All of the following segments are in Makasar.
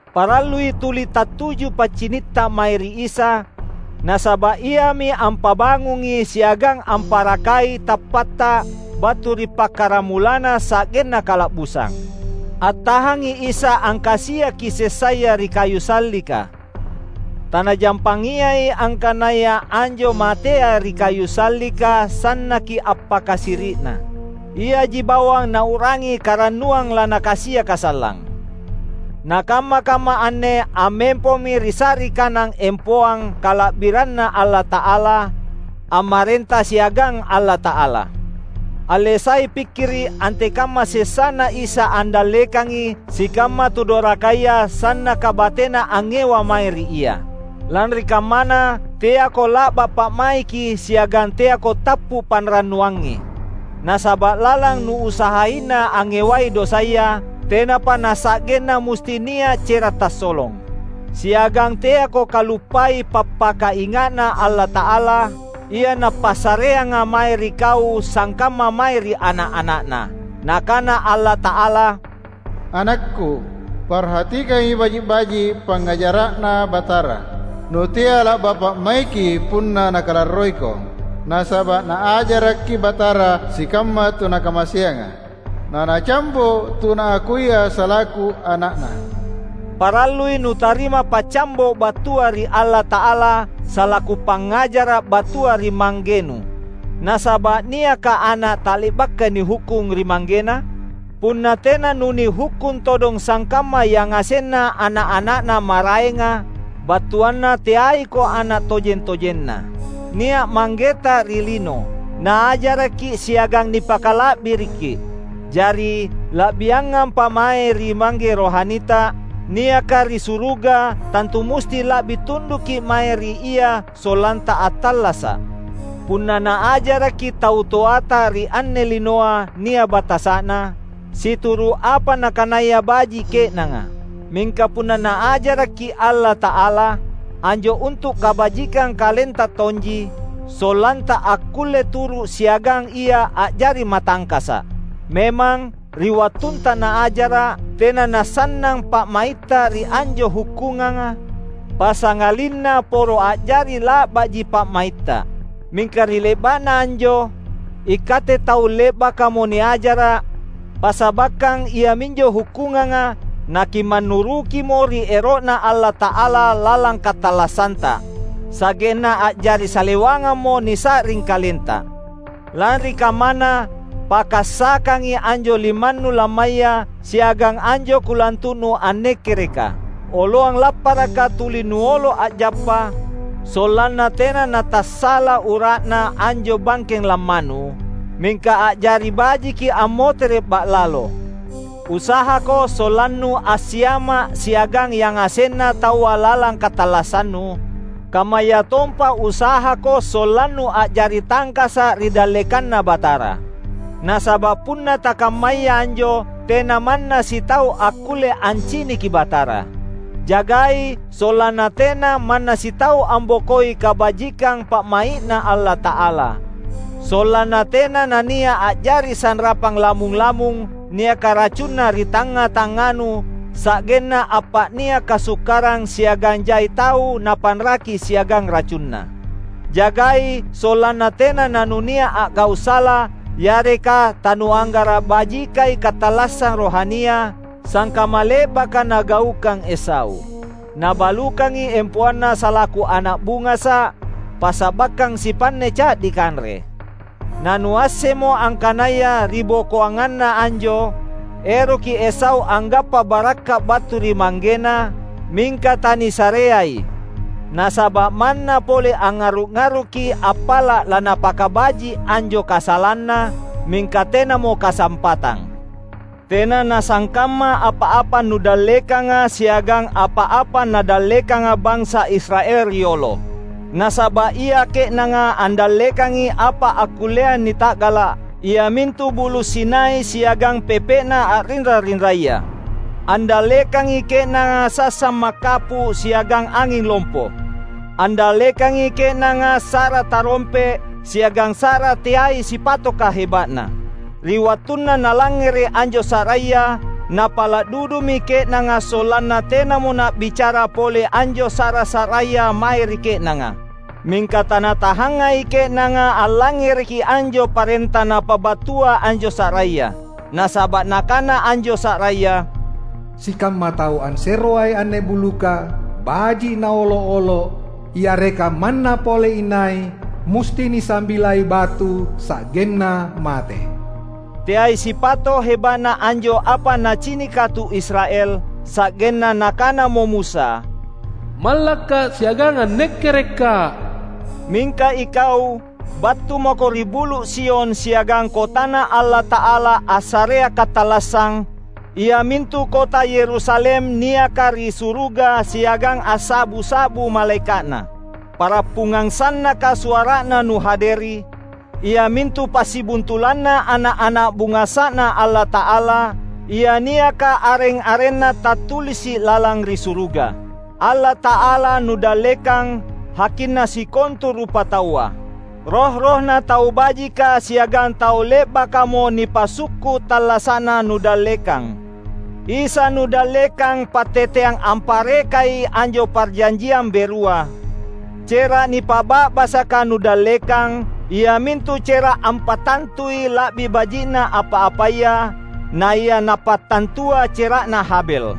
Parallui tuli tattuju paccinitta mae ri Isa, nasaba’ Iami ampabangungi siagang amparakai tappatta battu ri pakkaramulanna sa’genna kala’busang. Attahangi Isa angkasiaki sessaya ri kayu sallika! TaNajampangiai angkanaya anjo matea ri kayu sallika sannaki appakasiri’na. Iaji bawang Nau’rangi karannuang laNakasiaka sallang. Nakamma-kamma anne ammempomi ri sa’ri kanang empoang kala’biranNa Allata’ala, ammarenta siagang Allata’ala. Alle sai pikkiri’ antekamma sessaNa Isa andallekangi sikamma tu dorakaya sannaka batena angngewa mae ri Ia! Lanri kammana, teako la’ba pa’maiki siagang teako tappu’ panrannuangi. Nasaba’ lalang nuusahaina angngewai dosaya, tenapa nasa’genna musti nia’ cera’ tassolong. Siagang teako kaluppai pappakainga’Na Allata’ala, ia Napassareanga mae ri kau sangkamma mae ri ana’-ana’Na! Nakana Allata’ala, "AnakKu, parhatikangi baji’-baji’ pangngajara’Na Batara, nutea la’ba’ pa’maiki punna Nakalarroiko. Nasaba’ Naajaraki Batara sikamma tu Nakamaseanga, na Nacambo’ tu Naakuia salaku ana’Na." Parallui nutarima paccambo’ battua ri Allata’ala salaku pangngajara’ battua ri manggenu. Nasaba’ niakka ana’ tale’baka nihukkung ri manggena? Punna tena nunihukkung todong sangkamma yangasenna ana’-ana’Na maraenga, battuanna teaiko ana’ tojeng-tojenNa. Nia’ manggeta ri lino. Naajarakki’ siagang nipakala’biriki. Jari, la’biangampa mae ri Mangge rohanita, niaka ri suruga, tantu musti la’bi tundukki’ mae ri Ia sollanta attallasa’. Punna naajarakki’ tau toata ri anne linoa nia’ batasa’na, situru’ apa nakanaya baji’ ke’nanga. Mingka punna Naajarakki’ Allata’ala, anjo untu’ kabajikang kalenta tonji, sollanta akkulle turu’ siagang Ia a’jari matangkasa’. Memang, ri wattunta Naajara’, tena nasannang pa’maitta ri anjo hukkunganga, passangalinna poro a’jari la’baji pa’maitta. Mingka ri le’ba’na anjo, ikatte tau le’bakamo niajara’, passabakkang iaminjo hukkunganga na kimannurukimo ri ero’Na Allata’ala lalang katallassanta; sa’genna a’jari salewangammo nisa’ring kalenta. Lanri kammana, pakkassakangi anjo limannu lammaya siagang anjo kulantu’nu annekkereka! Oloang lapparaka tuli nuolo a’jappa, sollanna tena natassala ura’na anjo bangkeng lammanu, mingka a’jari bajiki ammotere’ ba’lalo. Usahako sollannu assiama’ siagang yangasenna taua lalang katallassannu; kammayatompa usahako sollannu a’jari tangkasa’ ri dallekanNa Batara. Nasaba’ punna takammaya anjo tena manna sitau akkulle anciniki Batara. Jagai sollanna tena manna sitau ambokoi kabajikang pa’mai’Na Allata’ala; sollanna tena nania’ a’jari sanrapang lamung-lamung niaka racunna ri tangnga-tangnganu sa’genna appa’nia’ kasukkarang siagang jai tau napanraki siagang racunna. Jagai sollanna tena nanunia’ a’gau’ sala yareka tanuanggara’ bajikai katallassang rohania, sangkamma le’baka nagaukang Esau. Nabalukangi empoanna salaku ana’ bungasa’, passabakkang sipanne ca’di kanre. Nanuassemmo angkanaya ribokoanganna anjo, eroki Esau anggappa barakka’ battu ri manggena, mingka tanisareai. Nasaba’ manna pole angngarru’-arruki appala’ lanapakabaji’ anjo kasalanna, mingka tenamo kasampatang. Tena nasangkamma apa-apa nudallekanga siagang apa-apa nadallekanga bansa Israel riolo. Nasaba’ ia ke’nanga andallekangi apa akkullea nita’gala’, iamintu Bulu’ Sinai siagang pepe’na a’rinra-rinraya; andallekangi ke’nanga sassang makkappu’ siagang anging lompo; andallekangi ke’nanga sa’ra tarompe’, siagang sa’ra teai sipatoka heba’na. Ri wattunna nalangngere’ anjo sa’raya, napala’ dudumi ke’nanga sollanna tenamo na’bicara pole anjo sa’ra-sa’raya mae ri ke’nanga. Mingka tanatahangai ke’nanga allangngereki anjo parenta napabattua anjo sa’raya. Nasaba’ nakana anjo sa’raya, "Sikamma tau anseroai anne buluka, baji’ naolo’-olo’, yareka manna pole inai, musti nisambilai batu sa’genna mate." Teai sipato’ heba’na anjo apa nacinika tu Israel; sa’genna nakanamo Musa, "Mallakka’ siagang annekkerekka’!" Mingka ikau, battu mako ri Bulu’ Sion siagang kotaNa Allata’ala assarea katallassang, iamintu kota Yerusalem niaka ri suruga siagang assa’bu-sa’bu malaeka’na. Pa’rappungang sannaka suara’na nuhaderi — iamintu passibuntulanna ana’-ana’ bungasa’Na Allata’ala, ia niaka areng-arenna tattulisi’ lalang ri suruga. Allata’ala nudallekang, Hakinna sikontu rupataua. Roh-rohna tau bajika siagang tau le’bakamo nipasukku’ tallasa’na nudallekang. Isa nudallekang patteteang amparekai anjo parjanjiang berua; cera’ nipa’ba’basaka nudallekang, iamintu cera’ ampattantui la’bi baji’na apa-apaya, naia napattantua cera’na Habel.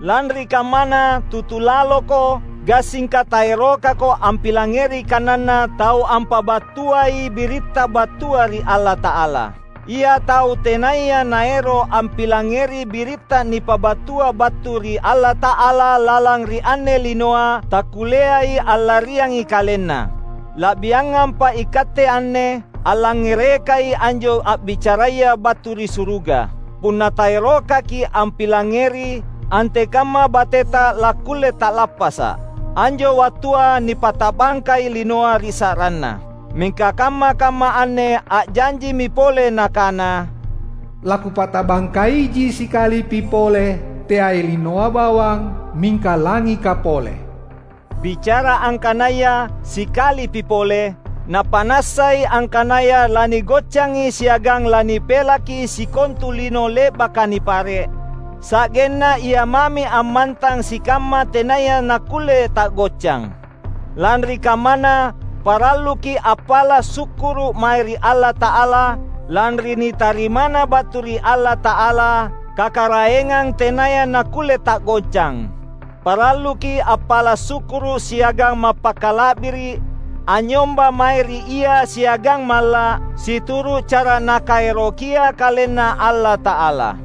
Lanri kammana, tutu laloko, gassingka taerokako ampilangngeri kananNa Tau ampabattuai biritta battua ri Allata’ala. Ia tau tenaya naero’ ampilangngeri biritta nipabattua battu ri Allata’ala lalang ri anne linoa, takkulleai allariangi kalenna. La’biangampa ikatte anne, allangngerekai anjo a’bicaraya battu ri suruga! Punna taerokaki’ ampilangngeri, antekamma bateta lakkulle ta’lappasa’. Anjo wattua nipata’bangkai linoa ri sa’ranNa. Mingka kamma-kamma anne a’janjimi pole Nakana, "LaKupata’bangka iji sikalipi pole, teai linoa bawang, mingka langika pole." Bicara angkanaya "sikalipi pole" Napa’nassai angkanaya lanigoccangi siagang lanipelaki sikontu lino le’baka nipare’, sa’genna ia mami ammantang sikamma tenaya nakkulle ta’goccang. Lanri kammana, paralluki’ appala’ sukkuru’ mae ri Allata’ala, lanri nitarimana battu ri Allata’ala, kakaraengang tenaya nakkulle ta’goccang. Paralluki’ appala’ sukkuru’ siagang mappakala’biri’ anynyomba mae ri Ia siagang malla’, situru’ cara Nakaerokia KalenNa Allata’ala.